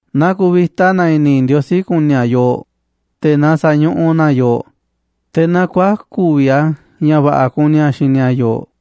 Na ku̱vi̱ta na i̱ni̱ Ndiosí ku̱ni̱ a̱ yooꞌ, te̱ na sa̱ñuꞌuꞌ na a̱ yooꞌ, te̱ na kuaku̱ vi̱ꞌ a̱ ña̱ va̱ꞌa̱ kuni a̱ xini a̱ yooꞌ.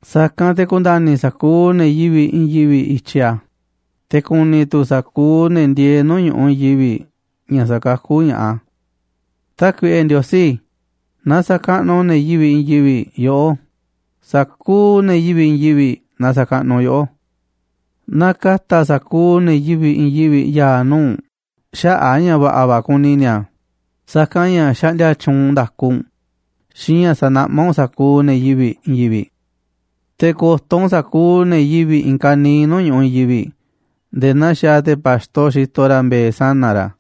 Sa̱kanꞌ te̱ ku̱nda̱ni̱ sa̱kuuꞌ ne̱ yivi̱ꞌ i̱i̱n yivi̱ꞌ i̱tyiꞌ a̱, te̱ ku̱ni̱ tu̱ sa̱kuuꞌ ne̱ ndieeꞌ nuu̱ꞌ ñu̱ꞌuꞌ i̱i̱n yivi̱ꞌ ña̱ sakakú ña̱ꞌaꞌ a̱. Tákuiꞌe Ndiosí, na sa̱kaꞌnuꞌ ne̱ yivi̱ꞌ i̱i̱n yivi̱ꞌ yoꞌó, sa̱kuuꞌ ne̱ yivi̱ꞌ i̱i̱n yivi̱ꞌ na sakaꞌnuꞌ yoꞌó. Na ka̱ta̱ sa̱kuuꞌ ne̱ yivi̱ꞌ i̱i̱n yivi̱ꞌ ya̱a̱ nuu̱ꞌ u̱nꞌ xaꞌa̱ꞌ a̱ ña̱ va̱ꞌa̱ va̱ kuni ni̱a̱, sa̱kanꞌ ña̱ xaꞌndia tyuunꞌ nda̱ku u̱nꞌ xiinꞌ ña̱ sa̱naꞌmá u̱nꞌ sa̱kuuꞌ ne̱ yivi̱ꞌ i̱i̱n yivi̱ꞌ. Te̱ ko̱to̱ u̱nꞌ sa̱kuuꞌ ne̱ yivi̱ꞌ i̱i̱n ka̱niiꞌ nuu̱ꞌ ñu̱ꞌuꞌ i̱i̱n yivi̱ꞌ nde̱e̱ naa xaaꞌ te̱ pa̱xto xitoꞌ ra̱ mbe̱e̱ sana̱ ra̱.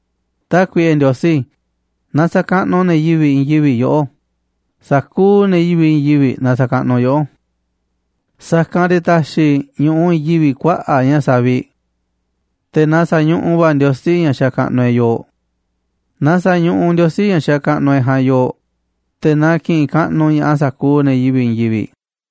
Tákuiꞌe Ndiosí, na sa̱kaꞌnuꞌ ne̱ yivi̱ꞌ i̱i̱n yivi̱ꞌ yoꞌó, sa̱kuuꞌ ne̱ yivi̱ꞌ i̱i̱n yivi̱ꞌ na sakaꞌnuꞌ yoꞌó. Sa̱kanꞌ te̱ ta̱xi̱ ñu̱ꞌuꞌ i̱i̱n yivi̱ꞌ kuaꞌa̱ꞌ ña̱ savi̱ꞌ. Te̱ na sa̱ñuꞌuꞌ va̱ Ndiosí, ña̱ xakaꞌnuꞌ e̱ꞌ, yooꞌ. Na sa̱ñuꞌuꞌ Ndiosí, ña̱ xakaꞌnuꞌ e̱ꞌ ja̱a̱nꞌ, yooꞌ, te̱ na ki̱ꞌi̱n kaꞌnuꞌ ña̱ꞌaꞌ sa̱kuuꞌ ne̱ yivi̱ꞌ i̱i̱n yivi̱ꞌ.